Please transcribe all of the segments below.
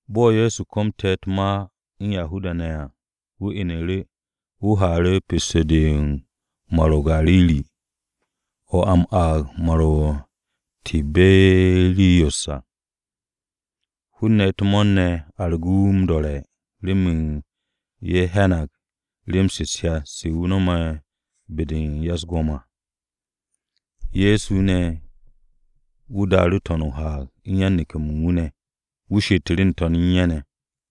Bo̱ Ye̱so komte̱ u̱t-ma u̱n Yahuda-ne̱ ne̱ à, wu̱ inu̱ru̱, wu̱ haaru̱ pesto-de u̱n Mar-o̱ o-Gariri, (mo̱ a m-aag Mar-o̱ o-Tiberiyos à). Hun-ne̱ u̱t-mo̱o̱r ne̱ argu̱ru̱ wu̱ m-do̱re̱ remen ye̱ hyanag rem-se u̱t-hyat se wu̱ no̱me̱ be-de u̱n ya-u̱s-go̱m à. Ye̱so ne̱, wu̱ daaru̱ n-to̱n o-haag u̱n yan-neke̱-mo̱ u̱n wu̱ ne̱. Wu̱ she'etu̱ru̱ n-to̱n u̱n ye̱ ne̱.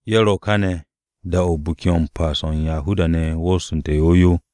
Ye̱ ro̱ káne̱, da-o̱ u̱n Biki-o̱ m-Pas o̱ u̱n Yahuda-ne̱ wosonte̱ yow yow.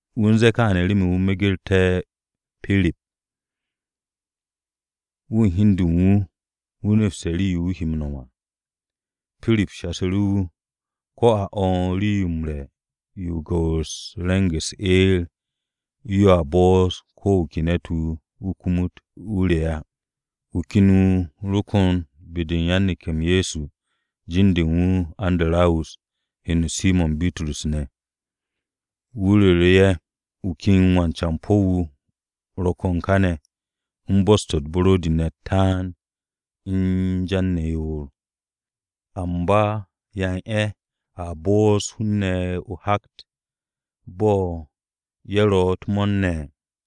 Wu̱ u̱n ze̱e̱ kááne̱ remen wu̱ megerté̱ Pirip. Wu̱ u̱n hi u̱n de u̱n wu̱, wu̱ nepste̱ rii-yo wu̱ he m-nom à. Pirip shasu̱ru̱ wu̱, “Ko̱ a o̱o̱n rii-yo m-re̱ yo u̱n gu̱wu̱s-de u̱n re̱ng-u̱s eer, yoa bo'os ko̱ wu̱ ke ne̱t-wu̱ kumut, wu̱ re̱ á.” Wu̱ ken wu̱ ro kon be-de u̱n yan-neke̱-m Ye̱so, jin-de u̱n wu̱ Andarawus (heno Simo̱n Bitrus ne̱). Wu̱ ru̱ru̱ ye̱, “Wu̱ ken wan-campo̱ wu̱ ro kon kàne̱ u̱n bos-to̱ u̱t-buro̱di ne̱ u̱t-taan u̱n jan ne̱ yoor. ¿Amba yan ye̱ a bo'os hun-ne̱ o-hakt bo̱ ye̱ ro̱ u̱t-mo̱o̱r ne̱?”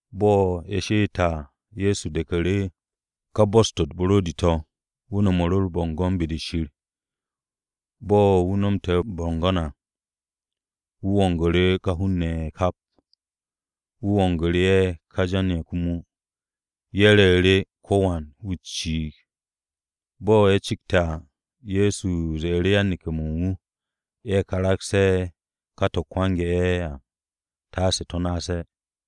Bo̱ ye̱ she'ette̱ à, Ye̱so de̱ku̱ru̱ ka bos-to̱ u̱t-buro̱di to̱. Wu̱ no̱mu̱ru̱ u̱r-bo̱ngo̱n be-de Shir. Bo̱ wu̱ nomte̱ u̱r-bo̱ngo̱n à, wu̱ wongu̱ru̱ ka hun-ne̱ ye̱ kap. Wu̱ wongu̱ru̱ ye̱ ka jan-ye̱ komo. Ye̱ re̱e̱ru̱, ko̱wan wu̱ ciig. Bo̱ ye̱ cikste̱ à, Ye̱so ze̱e̱ru̱ yan-neke̱-mo̱ u̱n wu̱, ye̱ karagse̱ ka to̱ kwange̱ ye̱ à, taase to̱ naase̱.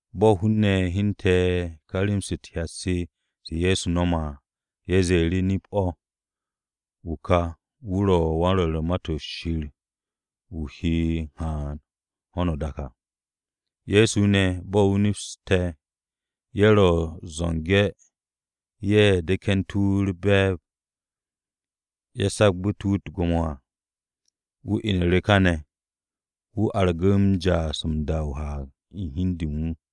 Bo̱ hun-ne̱ hyente̱ ka rem-se u̱t-hyat se se Ye̱so no̱me̱ à, ye̱ ze̱e̱ru̱, “Nip-o̱, wu̱ ka wu̱ ro̱ ka wan-rwo̱r u̱n Ma-to̱ Shir wu̱, wu̱ he m-haan ho̱no o-dak à!” Ye̱so ne̱, bo̱ wu̱ nepste̱ ye̱ ro̱ u̱t-zo̱nge̱ ye̱ de̱ke̱ntu̱ wu̱ u̱r-be̱e̱b, ye̱ sagbu̱té̱ wu̱ u̱t-gwo̱mo à, wu̱ inu̱ru̱ káne̱. Wu̱ argu̱ru̱ ja'as m-da o-haag u̱n hi u̱n de u̱n wu̱.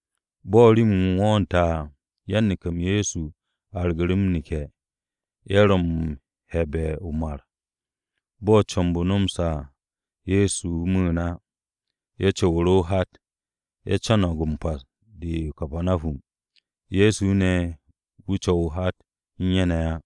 Bo̱ rim-m wo̱o̱nte̱ à, yan-neke̱-m Ye̱so argu̱ru̱ m-neke̱, ye̱ ro̱ m-he̱'e̱be̱ o-mar. Bo̱ comb-o nomoste̱ à, Ye̱so mu̱u̱n á. Ye̱ co̱wu̱ru̱ o-hat. Ye̱ co̱no̱g m-pas de o-Kapanahum. Ye̱so ne̱ wu̱ co̱w o-hat u̱n ye̱ ne̱ á.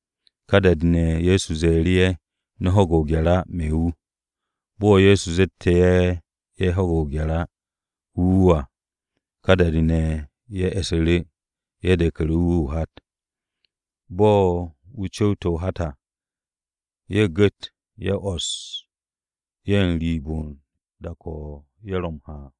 Ka da-de ne̱, Ye̱so ze̱e̱ru̱ ye̱, “No̱ ho̱ge̱ o-gye̱r á, me̱ wu̱.” Bo̱ Ye̱so zette̱ ye̱ yage̱ o-gye̱r, wu̱ wu̱ à, ka da-de ne̱ ye̱ e̱su̱ru̱, ye̱ de̱ku̱ru̱ wu̱ o-hat. Bo̱ wu̱ cu̱wte̱ o-hat à, ye̱ gu̱t, ye̱ 'wo̱s ye̱ wooste̱ n-riib n-dak o̱ ye̱ ro̱ m-ha à.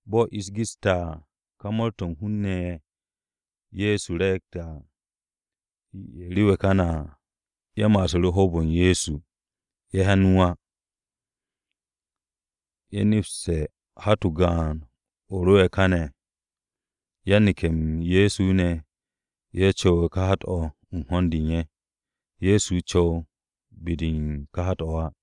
Bo̱ ish geste̱ à, ka mo̱o̱r-to̱ u̱n hun-ne̱ ye̱ ye̱ Ye̱so re̱e̱gte̱ à, ye̱ rewe̱ káne̱ à, ye̱ ma'assu̱ru̱ u̱n hoob-o Ye̱so. Ye̱ hyan wu̱ ne̱ á. Ye̱ nepste̱ hat-o gaan-o̱ ro'e̱ káne̱. Yan-neke̱-m Ye̱so ne̱, ye̱ co̱we̱ u̱n ka hat-o̱ u̱n ho̱n-de u̱n ye̱. Ye̱so co̱w be-de u̱n ka hat-o̱ á.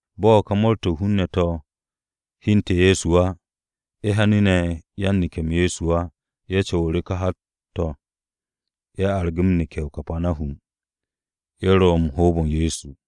Bo̱ ka mo̱o̱r-to̱ u̱n hun-ne̱ to̱ hyente̱ Ye̱so á, ye̱ hyanu̱ ne̱ yan-neke̱-m Ye̱so á, ye̱ co̱wu̱ru̱ ka hat-to̱ ye̱ argu̱ m-neke̱ o-Kapanahum. Ye̱ ro u̱n hoob-o Ye̱so.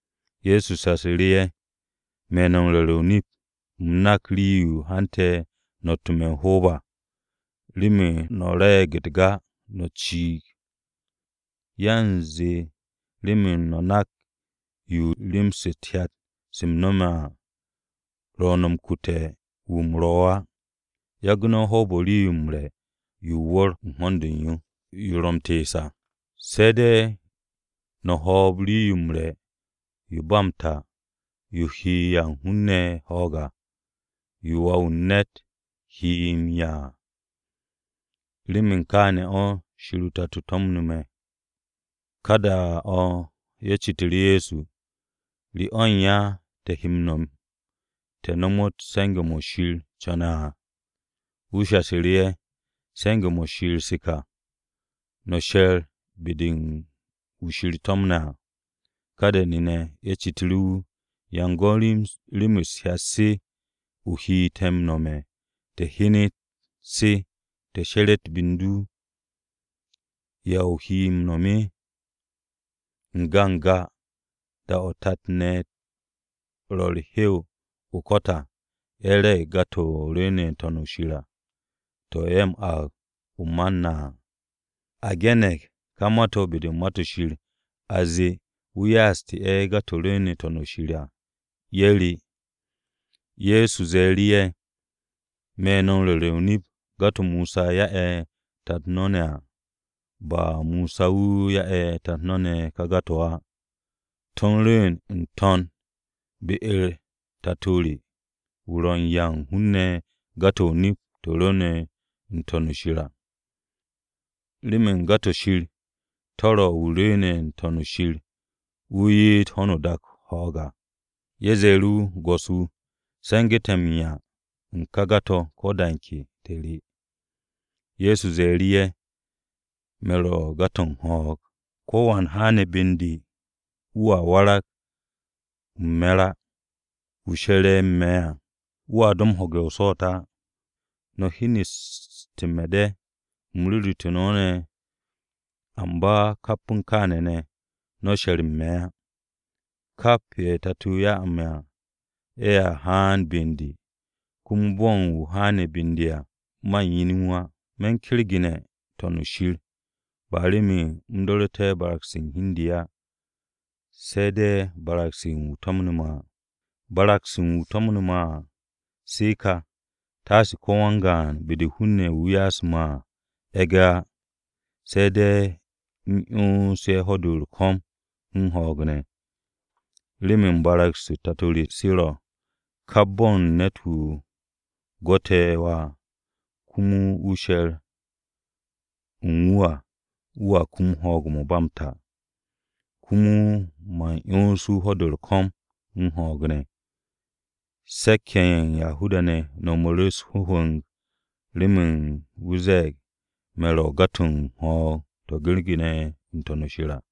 Ye̱so shasu̱ru̱ ye̱, “Me̱ no̱ m-ru̱re̱ o-nip, u̱m nak rii-yo hante̱ no̱ rotte̱ me̱ m-hoob à, remen no̱ re̱e̱g u̱t-buro̱di, no̱ ciig. Yanze remen no̱ nak yo rem-se u̱t-hyat se m-no̱me̱ à ro̱ no̱ m-kute̱ wu̱ u̱m ro̱ á. Yagu̱ no̱ hoob-o̱ u̱n rii-yo m-re̱ yo o-wu̱r u̱n ho̱n-de u̱n yo. Yo ro̱ m-tees à. Se̱ de̱ no̱ hoob rii-yo m-re̱ yo ba m-ta, yo he 'ya u̱n hun-ne̱ ho̱o̱g à, yo Wà-wu̱ u̱n ne̱t he no̱ m-'ya à. Remen kááne̱ o̱ Shir o-Tato to̱mo̱nte̱ me̱.” Ka da-o̱ ye̱ citu̱ru̱ Ye̱so, “¿Re o̱ u̱n ya te̱ he m-no̱m, te̱ nomot se̱nge̱-mo̱ Shir co̱ne̱ à?” Ye̱so shasu̱ru̱ ye̱, “Se̱nge̱-mo̱ Shir mo̱ ka: no̱ she̱r be-de u̱n wu̱ Shir to̱mne̱ à.” Ka da-de ye̱ citu̱ru̱ wu̱, “¿Yan go̱n rem-se u̱t-hyat se o he te̱ m-nome̱, te̱ hyenet se, te̱ she̱re̱t be u̱n du? ¿Ya o he m-no̱m? N-ga n-ga, da-o̱ tat te̱ ne̱ ro u̱r-hew o-ko̱t à, ye̱ re̱e̱ru̱ buro̱di-to̱ rwu̱u̱ne̱ n-To̱n u̱n shir à, to̱ ye̱ aage̱ o-Mana à. A ge̱ne̱g ka ma-to̱ be-de u̱n Ma-to̱ Shir, a zee, ‘Wu̱ ya'aste̱ u̱t-buro̱di to̱ rwu̱u̱ne̱ n-To̱n u̱n shir à, ye̱ re.’” Ye̱so ze̱e̱ru̱ ye̱, “Me̱ no̱ m-ru̱re̱ o-nip, buro̱di-to̱ Mosa ya'e̱ tat no̱ ne̱ à, ba Mosa wu̱ ya'e̱ tat-ne̱ no̱ ne̱ ka buro̱di-to̱ á. To̱ u̱n rwu̱u̱n n-To̱n be-u̱r Tato re, wu̱ ro̱ u̱n 'ya u̱n hun-ne̱ buro̱di-to̱ o-nip to̱ rwu̱u̱ne̱ n-To̱n o-shir à. Remen buro̱di-de Shir, de ro̱ wu̱ rwu̱u̱ne̱ n-To̱n shir wu̱ ye'et ho̱no o-dak ho̱o̱g à.” Ye̱ ze̱e̱ru̱ wu̱, “Go̱s-wu̱, se̱nge̱ te̱ m-'ya u̱n ka buro̱di-to̱ ko̱ da u̱n ke, te̱ re.” Ye̱so ze̱e̱ru̱ ye̱, “Me̱ ro̱ buro̱di-to̱ u̱n ho̱o̱g. Ko̱wan wu̱ haane̱ be u̱n de, wu̱a arag u̱n me̱r á. Wu̱ she̱re̱ u̱n me̱ à, wu̱a do ho̱ge̱ o-swo̱o̱t á. No̱ hyeneste̱ me̱ de̱, u̱m ru̱ru̱te̱ no̱ ne̱, amba kap u̱n kááne̱ ne̱, no̱ she̱r u̱n me̱ á. Kap ye̱ Tato-o ya'e̱ me̱ à ye̱a haan be u̱n de. Komo bo̱ u̱n wu̱ haane̱ be u̱n de à, man yen wu̱ á. Me̱ u̱n kergene̱ n-To̱n u̱n shir, ba remen u̱m do̱ru̱te̱ barag-se u̱n hi u̱n de á, se̱ de̱ barag-se u̱n wu̱ to̱mne̱ me̱ à. Barag-se u̱n wu̱ to̱mne̱ me̱ ne̱ à, se ka, taase ko̱ wan-gaan be-de u̱n ka hun-ne̱ ye̱ wu̱ ya'asu̱ me̱ à e̱ge̱ á. Se̱ de̱ u̱m 'yons ye̱ ho̱-de u̱r-ko̱m u̱n ho̱o̱g ne̱. Remen barag-u̱s Tato re se ro̱, kap bo̱ u̱n ne̱t-wu̱ gwo̱te̱ Wà komo wu̱ she̱r u̱n wu̱ à, wu̱a kum ho̱o̱g-o̱ ba m-ta. Komo man 'yons wu̱ ho̱-de u̱r-ko̱m u̱n ho̱o̱g ne̱.” Se̱k-ye̱ ye̱ u̱n Yahuda-ne̱ no̱mu̱ru̱ wu̱ u̱s-hwu̱mu̱g remen wu̱ ze̱e̱g, “Me̱ ro̱ buro̱di-to̱ u̱n ho̱o̱g to̱ kergene̱ n-To̱n shir à.”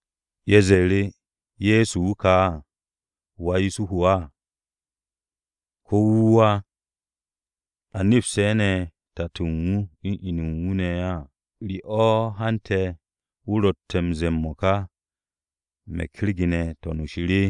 Ye̱ ze̱e̱ru̱, “Ye̱so wu̱ ka, ¿wà Yusuhu á? ¿Ko̱ wu̱ wu̱ á? ¿A nepse̱ ne̱ tato u̱n wu̱ u̱n inu u̱n wu̱ ne̱ á? ¿Re o̱ hante̱ wu̱ ro̱tte̱ m-ze̱e̱ m-mo̱ka, ‘Me̱ u̱n kergene̱ n-To̱n u̱n shir’?”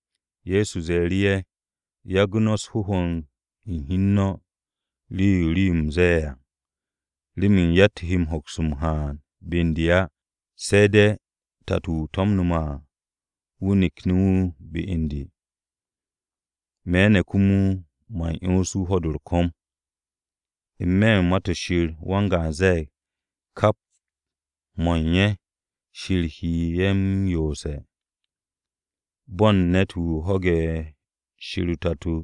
Ye̱so ze̱e̱ru̱ ye̱, “Yagu̱ no̱ u̱s-hwu̱mu̱g u̱n hi u̱n no̱ u̱n rii-yo u̱m ze̱e̱ á. Remen yatt-wu̱ he hoks m-haan be u̱n de á, se̱ de̱ Tato-o̱ to̱mne̱ me̱ à wu̱ nakne̱ wu̱ be u̱n de. Me̱ ne̱ komo, man 'yons wu̱ ho̱-de u̱r-ko̱m. N-me̱ Ma-to̱ Shir, wan-Rwo̱r u̱n Ma-to̱ Shir ze̱e̱g, ‘Kap mo̱ u̱n ye̱ Shir he ye̱ m-yoose̱.’ Bo̱n ne̱t-wu̱ ho̱ge̱ Shir o-Tato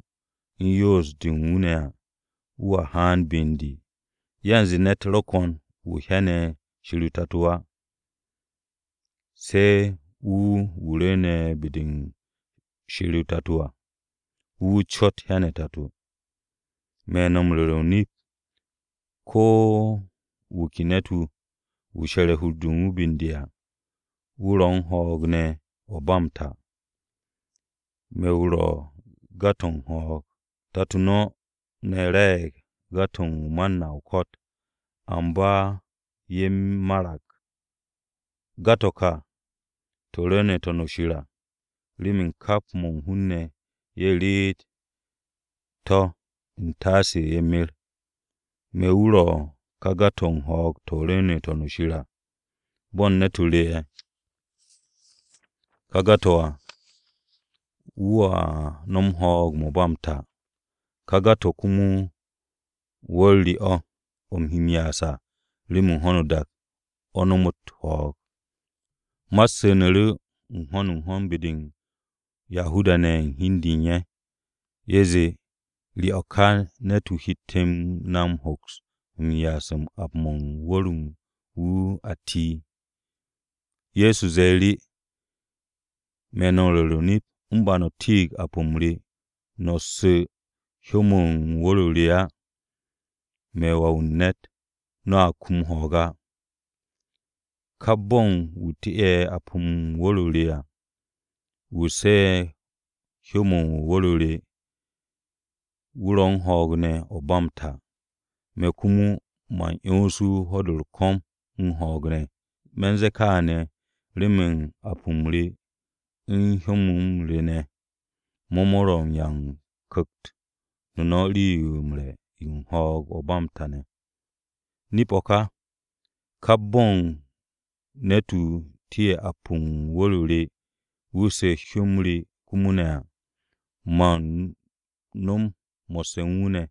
u̱n yoos-de u̱n wu̱ ne̱ à, wu̱a haan be u̱n de. Yanze ne̱t ro̱ ko̱n wu̱ hyane̱ Shir o-Tato á, se̱ wu̱ wu̱ rwu̱u̱ne̱ be-de Shir o-Tato à. Wu̱ wu̱ cot, hyane̱ o-Tato. Me̱ no̱ m-ru̱re̱ o-nip, ko̱ wu̱ ke ne̱t-wu̱, wu̱ she̱re̱ hur-de u̱n wu̱ be u̱n de à, wu̱ ro̱ u̱n ho̱o̱g ne̱ o̱ u̱n ba m-ta. Me̱ wu̱ ro̱ buro̱di-to̱ u̱n ho̱o̱g. Tato no̱ ne̱ re̱e̱g buro̱di-to̱ o-Mana o-ko̱t, amba ye̱ marag. Buro̱di-to̱ ka to̱ rwu̱u̱ne̱ n-To̱n u̱n shir à, remen kap mo̱ u̱n hun-ne̱ ye̱ reet to̱ u̱n taase ye̱ mer. Me̱ wu̱ ro̱ ka buro̱di-to̱ u̱n ho̱o̱g-to̱ to̱ rwu̱u̱ne̱ n-To̱n u̱n shir à. Bo̱n ne̱t-wu̱ re̱ ka buro̱di-to̱ à, wu̱a nom ho̱o̱g-mo̱ ba m-ta. Ka buro̱di-to̱ komo wu̱r-o re o̱, o̱ u̱m he m-ya'as à, remen ho̱no o-dak o̱ nomot ho̱o̱g.” Ma-u̱t su̱nu̱ru̱ n-ho̱n n-ho̱n be-de u̱n Yahuda-ne̱ u̱n hi u̱n de u̱n ye̱. Ye̱ zee, “¿Re o̱ ka ne̱t-wu̱ hette̱ na hoks m-ya'as u̱n ap-mo̱ u̱n wu̱r-o̱ u̱n wu̱ a ti?” Ye̱so ze̱e̱ru̱, “Me̱ no̱ m-ru̱re̱ o-nip, u̱n ba no̱ ti'ig ap-m re, no̱ su̱ hyó-mo̱ u̱n wu̱r-o re á, me̱ Wà-wu̱ u̱n ne̱t, no̱a kum ho̱o̱g á. Kap bo̱ u̱n wu̱ ti'e̱ ap-mo̱ u̱n wu̱r-o re à, wu̱ su̱ hyó-mo̱ u̱n wu̱r-o re, wu̱ ro̱ u̱n ho̱o̱g ne̱ o̱ u̱n ba m-ta. Me̱ komo, man 'yons wu̱ u̱n ho̱-de u̱r-ko̱m u̱n ho̱o̱g ne̱. Me̱ u̱n ze̱e̱ kaane̱, remen ap-m re u̱n hyó-m re ne̱, mo̱ ro̱ m-'ya u̱n ku̱kt-o no̱ rii-yo m-re̱ u̱n ho̱o̱g-o̱ ba m-ta ne̱. Nip-o o̱ ka. Kap bo̱ u̱n ne̱t-wu̱ ti'e̱ ap-mo̱ u̱n wu̱r-o re wu̱ su̱ hyó-m re komo ne̱ à, man nom mo̱sse̱ u̱n wu̱ ne̱,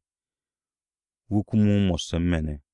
wu̱ komo mo̱sse̱ u̱n me̱ ne̱.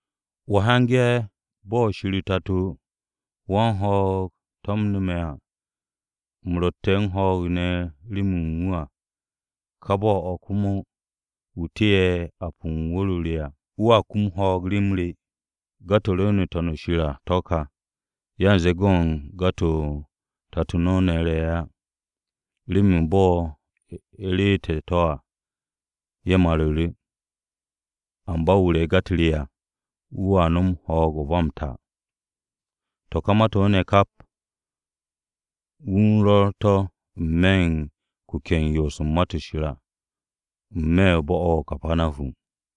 Wo̱ hyange̱ bo̱ Shir o-Tato wan-ho̱o̱g to̱mne̱ me̱ à, u̱m ro̱tte̱ u̱n ho̱o̱g ne̱ remen wu̱ à. Ka bo̱-o̱ komo, wu̱ ti'e̱ ap-mo̱ u̱n wu̱r-o re à, wu̱a kum ho̱o̱g rem re. Buro̱di-to̱ rwu̱u̱ne̱ n-To̱n à to̱ ka. Yanze go̱n buro̱di-to̱ tat no̱ ne̱ re̱ á. Remen bo̱ ye̱ reete̱ to̱ à, ye̱ maru̱ru̱. Amba wu̱ re̱ ga-u̱t re à, wu̱a nom ho̱o̱g-o̱ u̱n ba m-ta.” To̱ ka ma-to̱ ne̱ kap, wu̱ u̱n rwo̱r to̱ n-me̱ u̱n kuke̱-o̱ u̱n yoos u̱n Ma-to̱ Shir, n-me̱ u̱n bo̱-o̱ o-Kapanahum.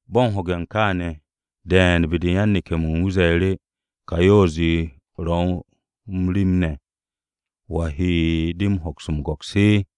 Bo̱ m-ho̱ge̱ kááne̱, de̱e̱n be-de u̱n yan-neke̱-mo̱ u̱n wu̱ ze̱e̱ru̱, “Ka yoos-de ro̱ u̱n rem ne̱. ¿Wa he de hoks m-go̱ks?”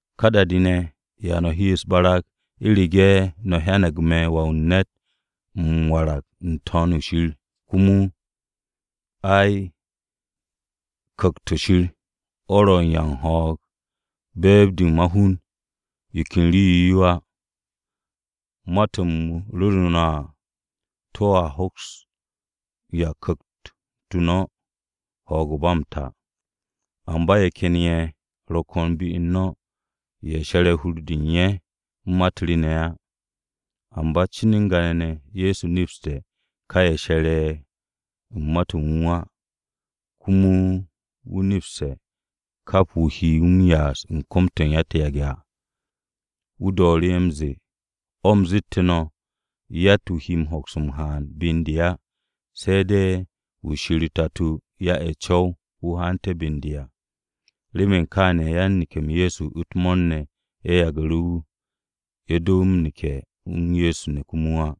¿Ka da-de ne̱, ya no̱ he u̱s-barag u̱rege̱ no̱ hyanag me̱ Wà-wu̱ u̱n ne̱t, m-warag n-To̱n u̱n shir komo? Ai, Ku̱kt-o̱ Shir o̱ ro̱ u̱n 'ya u̱n ho̱o̱g. Be̱e̱b-de ma-hun yo ken rii-yo yo á. Ma-to̱ u̱m ru̱ru̱ no̱ à to̱a hoks m-'ya u̱n ku̱kt-o no̱ ho̱o̱g-o̱ ba m-ta. Amba ye̱ ken ye̱ ro̱ ko̱n be u̱n no̱, ye̱ she̱re̱ hur-de u̱n ye̱ u̱n ma-u̱t re á.” (Amba cin n-ga ne̱, Ye̱so nepste̱ ka ye̱ she̱re̱ u̱n Ma-to̱ u̱n wu̱ á. Komo wu̱ neps ka wu̱ he wu̱ m-ya'as u̱n kom-to̱ u̱n ya-u̱t-yage̱ à.) Wu̱ dooru̱ m-ze̱e̱, “O̱ u̱m zette̱ no̱, yatt-wu̱ he hoks m-haan be u̱n de à, se̱ de̱ wu̱ Shir o-Tato ya'e̱ co̱w-yo wu̱ haante̱ be u̱n de à.” Remen kááne̱, yan-neke̱-m Ye̱so u̱t-mo̱o̱r ne̱, ye̱ yagu̱ru̱ wu̱. Ye̱ do m-neke̱ u̱n Ye̱so ne̱ komo á.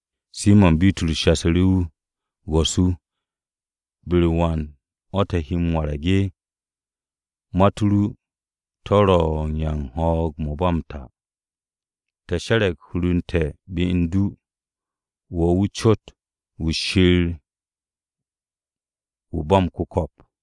Simo̱n Bitrus shasu̱ru̱ wu̱, “Go̱s-wu̱, ¿be-u̱r wan o̱ te̱ he m-warag? Ma-u̱t ru to̱ ro̱ u̱n 'ya u̱n ho̱o̱g-o̱ ba m-ta! Te̱ she̱re̱g hur u̱n te̱ be u̱n du. Wo̱ wu̱ cot wu̱ Shir, wu̱ ba m-ku̱ko̱p.”